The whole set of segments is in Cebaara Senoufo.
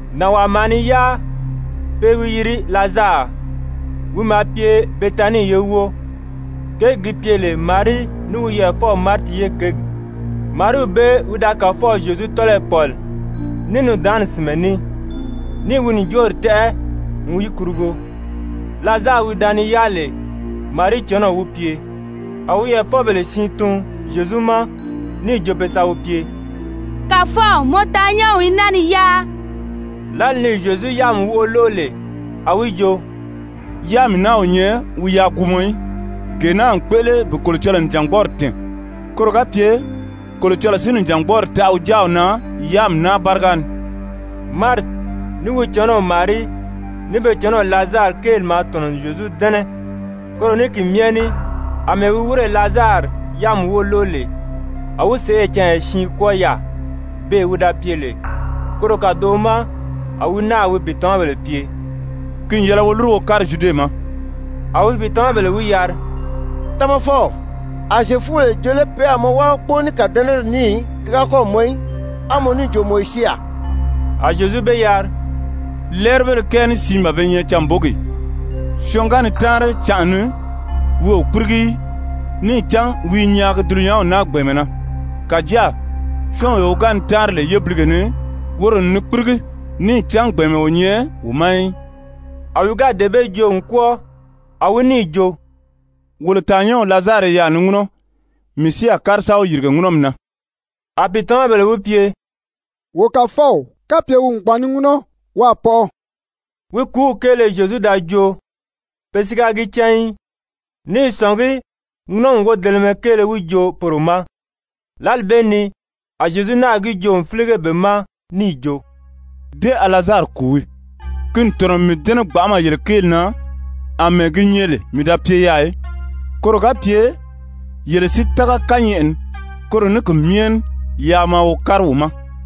Nànwaa maa ni yáa, pe i wi yiri Lazari, wi maa pye Betanii ye wóo, kěgi gi pye lè Marii ní wi yɛʔɛfɔw Mariti ye kěgi. Mariiw bee wi da Kàfɔw Zyezu tɔ́lɔyi pɔ̀li ní nùndaanni sìnmɛ ní, níì wi ǹjoori tɛ́ʔɛ n yi kurugo, Lazari wi da ni yáa lè, Marii cɔnɔɔ wi pye. A wi yɛʔɛfɔbèle siin tun Zyezu ma, níì jo pe sa wi pye: «Kàfɔw, mɔ taannyɛnw i naa ni yáa.» Lǎli ni Zyezu yáami wóʔo lóʔo lè, a wi jo: «Yáami naa o nyɛ wi yaàguumɔ í, gee naa n kpéʔele bi Kolocɔlɔɔ nìjangbɔɔri tɛ̀ɛn, koro ga pye Kolocɔlɔɔ si nìjangbɔɔri taʔa wi Jáaw na yáami naa báriga ni.» Mariti, ní wi cɔnɔw Marii, ní be cɔnɔw Lazari kéeli maa tɔ̀nɔ n Zyezu dɛ́nɛ. Koro ní ki myɛ ní àmɛɛ wi wírè Lazari yáami wóʔo lóʔo lè, a wi sèʔê canya siin kwɔ́ɔ yaà, beè wi da pye lè. Koro kàdoʔo ma a wi náà wi pìitamabèle pye: «Ki n yɛlɛ wo lúru wo kári Zyude ma.» A wi pìitamabèle wi yari: «Tamafɔw, a Zyefubèle jo lé pe a mɔ wábagi kpóo ní kàdɛnɛri ní ki ga mɔn í, á mɔ níì jo mɔ i syée yaà?» A Zyezu be yari: «Lɛ́ɛribéle kɛɛ ní siin ban be nyɛ canbogi ì? Syɔɔn ga ni táanri canʔa ni, wi o kpírigi í, níì cán wi i nyaagi dulunyanw naa gbɛ̀ɛnmɛ na. Kàjáa syɔ́ɔnwee wi ga ni táanri lè yébilige ni, woro n ni kpírigi, níì cán gbɛ̀ɛnmɛ o nyɛ wi ma í.» A wi ga dee bee joo n kwɔ́ɔ, a wi níì jo: «Wolo tàannyɛnw Lazari i yaà ni ŋúnɔ, mii si a kári sa wi yìrige ŋúnɔmi na.» A pìitamabèle wi pye: «Wo Kàfɔw, kapye wi n gbàn ni ŋúnɔ, wi a pɔʔɔ.» Wi kùúw kéele Zyezu da joo, pe si ga gi cán í, ní i sɔ̀ngí ŋúnɔmi wodelemɛ kéele wi joo poro ma. Lǎli bee ni a Zyezu náà gi joo n fílige be ma níì jo: «Dé a Lazari kùu wii. Ki n tɔ̀nɔ n mii dɛ́nɛ gbanʔama yele kéeli na, àmɛɛ gi nyɛ lè mii da pye yaà í, koro ga pye yele si tága kányɛʔɛ ni. Koro ní ki myɛ ní yaa maa wo kári wi ma.»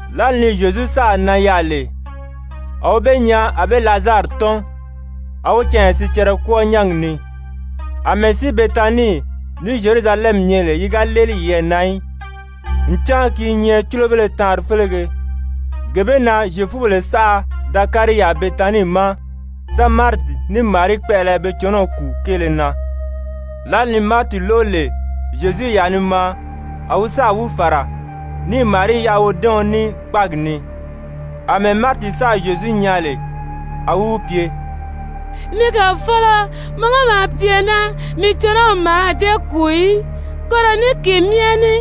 Lǎli ni Zyezu sáà nan yaà lè, a wi be nyaa a be Lazari tɔ́n, a wi canya sicɛrɛ kwɔ́ɔ nyángi ni. Amɛɛ si Betanii ní Zyerusalɛmi nyɛ lè yi ga léeli yiyɛɛ na í, ncan ki i nyɛ cúlobéle taanri félege, gee bee na Zyefubéle saʔa da kári yaà Betanii ma sa Mariti ní Marii kpɛʔɛlɛ be cɔnɔw kùu kéele na. Lǎli ni Mariti lóʔo lè Zyezu i yaà ni maa, a wi sáà wi fàra, níì Marii yaʔa wodɛ́ɛɔn ní kpáagi ni. Amɛɛ Mariti sáà Zyezu nyaa lè, a wi wi pye: «Ni Kàfɔlɔ, mɔ ga maa pye naa, mii cɔnɔw mǎà dée kùu í. Koro ní ki myɛ ní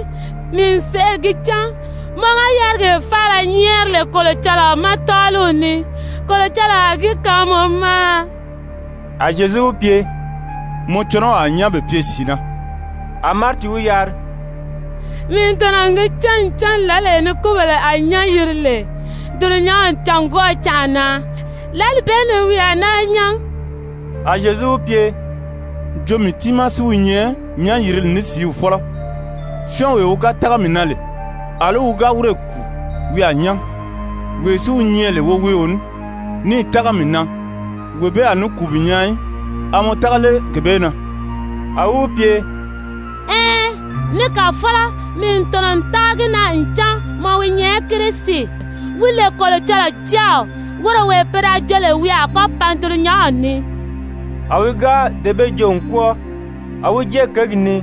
mii n sèʔê gi cán mɔ ga yárigee faala nyɛ́ɛri lè Kolocɔlɔɔ ma tɔ́ɔliw ni, Kolocɔlɔɔ a gi kaan mɔ ma.» A Zyezu wi pye: «Mɔ cɔnɔw a nyán bi pye sìi na.» A Mariti wi yari: «Mii n tɔ̀nɔ n gi cán ncan lǎlee ni kúbèle a nyán yiri lè dulunyanw cângwɔʔɔ canʔa na, lǎli bee ni wi a naa nyán.» A Zyezu wi pye: «Jo mii tiimaa si wi nyɛ nyán-yirili ní sìíw fɔ́lɔ. Syɔ́ɔnwee wi ga tága mii na lè, àlí wi ga wírè kùu, wi a nyán. Wee si wi nyɛ lè woweeo ní, níì tága mii na, wee bee a ní kùu bi nyaa í. A mɔ tága lé gee bee na?» A wi wi pye: «Ɛɛn, ni Kàfɔlɔ, mii n tɔ̀nɔ n tága gi na ncan mɔ wi nyɛ Kirisi, wi lè Kolocɔlɔɔ Jáaw, woro wee pe da jo lè wi a kɔ́ pan dulunyanw ni.» A wi ga dee bee joo n kwɔ́ɔ, a wi jée kěgi ni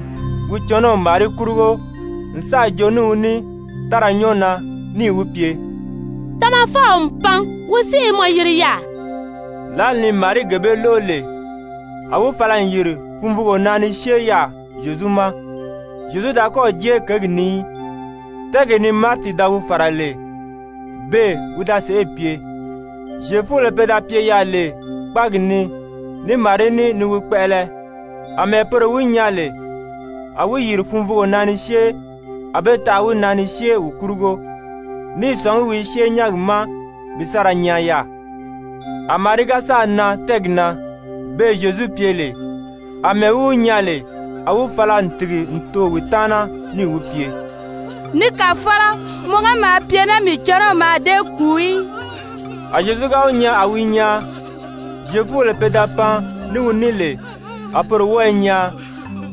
wi cɔnɔw Marii kurugo n sáà joo ní wi ní tára nyɔ́ɔ na níì wi pye: «Tamafɔw n pan, wi si i mɔ yiri yaà.» Lǎli ni Marii gee bee lóʔo lè, a wi fala n yìri funvuugo na ni syée yaà Zyezu ma. Zyezu da kɔ́ɔ̀ jée kěgi ni í, tɛ́ɛgee ni Mariti da wi fàra lè, beè wi da sèʔê pye. Zyefubèle pe da pye yaà lè kpáagi ni ní Marii ní ni wi kpɛʔɛlɛ, àmɛɛ poro wi nyaa lè a wi yìri funvuugo na ni syée, a be taʔa wi na ni syée wi kurugo, ní i sɔ̀ngí wi i syée nyángi ma bi sa ra nyaan yaà. A Marii ga sáà nan tɛ́ɛgi na, beè Zyezu pye lè, àmɛɛ wi wi nyaa lè, a wi fala n tìgi n too wi taana níì wi pye: «Ni Kàfɔlɔ, mɔ ga maa pye naa, mii cɔnɔw mǎà dée kùu í.» A Zyezu ga wi nyaa a wi i nyaan, Zyefubèle pe da pan ní wi ní lè a poro wɔ́ɔ i nyaan,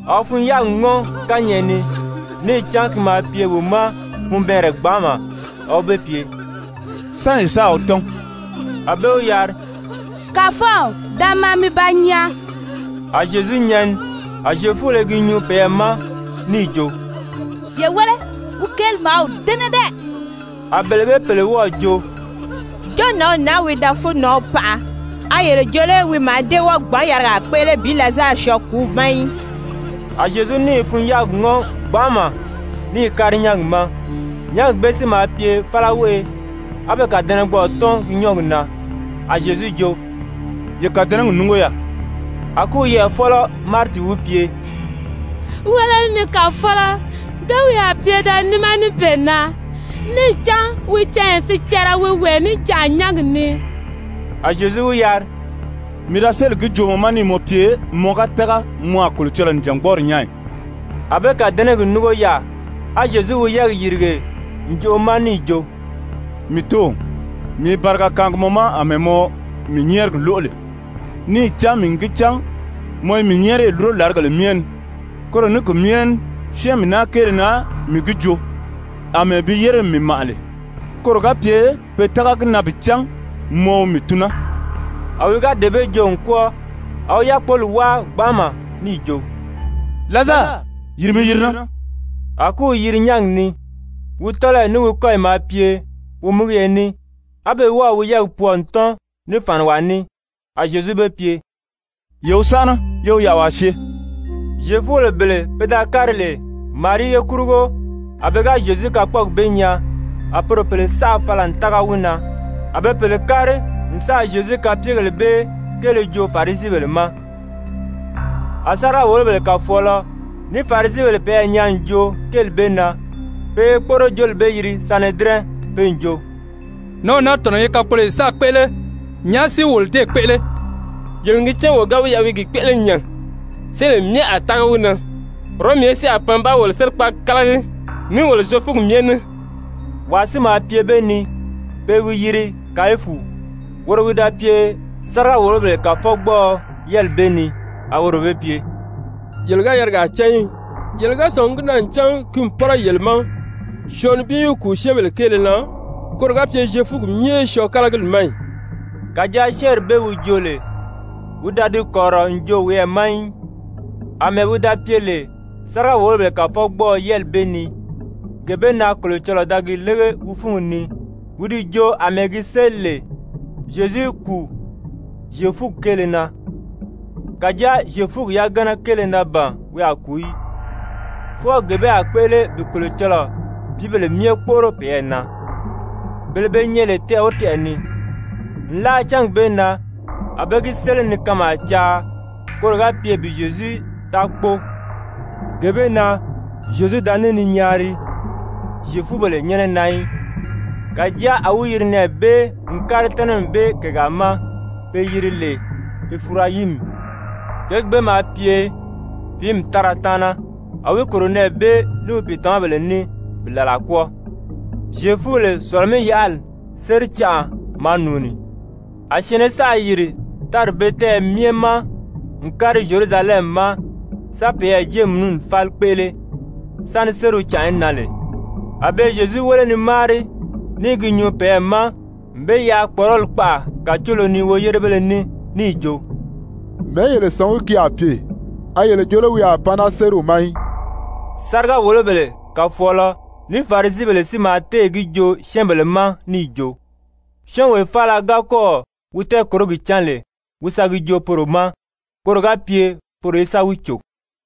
a wi fun-yáagi ŋɔ́n kányɛʔɛ ni, níì cán ki maa pye wi ma funbɛɛnrɛ gbanʔama. A wi be pye: «Sán ye sáà wi tɔ́n?» A be wi yari: «Kàfɔw, da maa mi ba nyaa.» A Zyezu nyɛni. A Zyefubèle i gi nyuu peyɛɛ ma níì jo: «Ye wéle, wi kéeli maa wi dɛ́nɛ dɛ.» A bele bee pèle wɔ́ɔ̀ jo: «Jo nǎnw naa wi da fúunnanw paʔa, a yele jo lé wi mǎà dée wɔ́ɔ gbǎn yarigaa kpéʔele bi Lazari syɔɔ kùúw ma í?» A Zyezu níì fun-yáagi ŋɔ́n gbanʔama níì kári nyángi ma. Nyángi bee si maa pye fálaweʔe, á be kàdɛnɛgbɔʔɔ tɔ́n gi nyɔ́ɔgi na. A Zyezu jo: «Ye kàdɛnɛgi núngo yaà.» A kúw yɛʔɛfɔlɔ Mariti wi pye: «Wéle, ni Kàfɔlɔ, dé wi a pye da níma níbeena, níì cán wi canya sicɛrɛ wi wee níjanʔa nyángi ni.» A Zyezu wi yari: «Mii da sélì gi joo mɔ ma níì mɔ pye mɔ ga tága, mɔ a Kolocɔlɔɔ nìjangbɔɔri nyaa ì?» A be kàdɛnɛgi núngo yaà. A Zyezu wi yɛ́ɛgi yìrige ǹjoʔo ma níì jo: «Mii Tóow, mii i bariga kaangi mɔ ma àmɛɛ mɔ mii nyɛ́ɛrigi lóʔo lè. Níì cán mii n gi cán mɔ i mii nyɛ́ɛriyi lúro làrigèle myɛ ni, koro ní ki myɛ ní syɛ́ɛnmi naa kéele na mii gi joo, àmɛɛ bi yére n mii màʔa lè, koro ga pye pe tága gi na bi cán mɔ wi mii tun naa.» A wi ga dee bee joo n kwɔ́ɔ, a wi yákpoli wáa gbanʔama níì jo: «Lazari, yìri mi yiri naa!» A kúw yiri nyángi ni, wi tɔ́lɔyi ní wi kɔ́yi maa pye womigiye ní, á be wɔ́ɔ̀ wi yɛ́ɛgi pwɔɔ n tɔ́n ní fàniwaa ní. A Zyezu be pye: «Ye wi sánʔana, yé wi yaʔa waa syée.» Zyefubèle bele pe da kári lè Marii ye kurugo, a pe ga Zyezu kakpɔɔgi bee nyaa, a poro pèle saʔa fala n tága wi na. A be pèle kári n sáà Zyezu kapyegèle bee kéele joo Farisibèle ma. A sáriga-wòlobèle kàfɔɔlɔ ní Farisibèle peyɛɛ nyaa n joo kéeli bee na, pe i kpóʔorojooli bee yiri Sanedirɛn, pe n jo: «Nǎnw naa tɔ̀nɔ́ i kakpoloyo saʔa kpéʔele, nyàʔá si wolo déē kpéʔele? Yele n gi cán wo ga wi yaʔa wi i gi kpéʔele nya, syɛ́ɛnbèle myɛ a tága wi na. Wɔrɔmi ye si a pan ba wolo sérikpaagi kálagi ní wolo Zyefuugi myɛ ní.» Wàa si maa pye be ni, pe i wi yiri Kayifu, woro wi da pye sáriga-wòlobèle kàfɔgbɔɔɔ yɛ́ɛli bee ni, a woro be pye: «Yele ga yarigaa cán í. Yele ga sɔ̀ngi gi na ncan ki n pɔ́rɔ yele ma syɔɔn nibin í kùu syɛ́ɛnbèle kéele na, koro ga pye Zyefuugi myɛ í syɔɔ kálagili ma í.» Kàjáa syɛ́ɛnri bee wi joo lè, wi da di kɔ̀rirɔ n joo wiyɛɛ ma í. Amɛɛ wi da pye lè sáriga-wòlobèle kàfɔgbɔɔɔ yɛ́ɛli bee ni, gee bee na Kolocɔlɔɔ da gi lége wi fúngi ni wi di joo àmɛɛ gi séli lè Zyezu í kùu Zyefuugi kéele na. Kàjáa Zyefuugi yagana kéele na ban wi a kùu í, fwɔɔ gee bee a kpéʔele bi Kolocɔlɔɔ pìíbèle myɛ kpóʔoro peyɛɛ na, bele be nyɛ lè tɛʔɛ o tɛʔɛ ni. Nlaa cángi bee na a be gi séli ni kanmaa caa, koro ga pye bi Zyezu taa kpóo. Gee bee na Zyezu da ní ni nyaari Zyefubèle nyɛ́nɛ na í. Kàjáa a wi yiri nɛɛ bee n kári tɛ́nɛmi bee kègaa ma be yiri lè Efirayimi. Kěgi bee maa pye fìími tára taana, a wi kòro nɛɛ bee ní wi pìitamabèle ní bi làla kwɔ́ɔ. Zyefubèle Sɔ̀lɔ-mí-yaʔali séri canʔa maa nùuni, a syɛ̀ɛnnɛ saʔa yìri tári bee tɛ́ɛyɛ myɛ ma n kári Zyerusalɛmi ma sa peyɛɛ jéemununi fáli kpéʔele sáni sériw canʔa í nan lè. A be i Zyezu wéle ni máari ní i gi nyuu peyɛɛ ma n be yaʔa kpɔ̀ʔɔrɔli kpaʔa kàcoolo ni woyérebéle ní, níì jo: «Mɛ̀ɛ́ yele sɔ̀ngí ki a pye? A yele jo lé wi a pan naa sériw ma í?» Sáriga-wòlobèle kàfɔɔlɔ ní Farisibèle si maa téè gi joo syɛ́ɛnbèle ma níì jo, syɔ́ɔnwee faala ga kɔ́ɔ̀ wi tɛɛkòrogi cán lè, wi sa gi joo poro ma, koro ga pye poro í sa wi cò.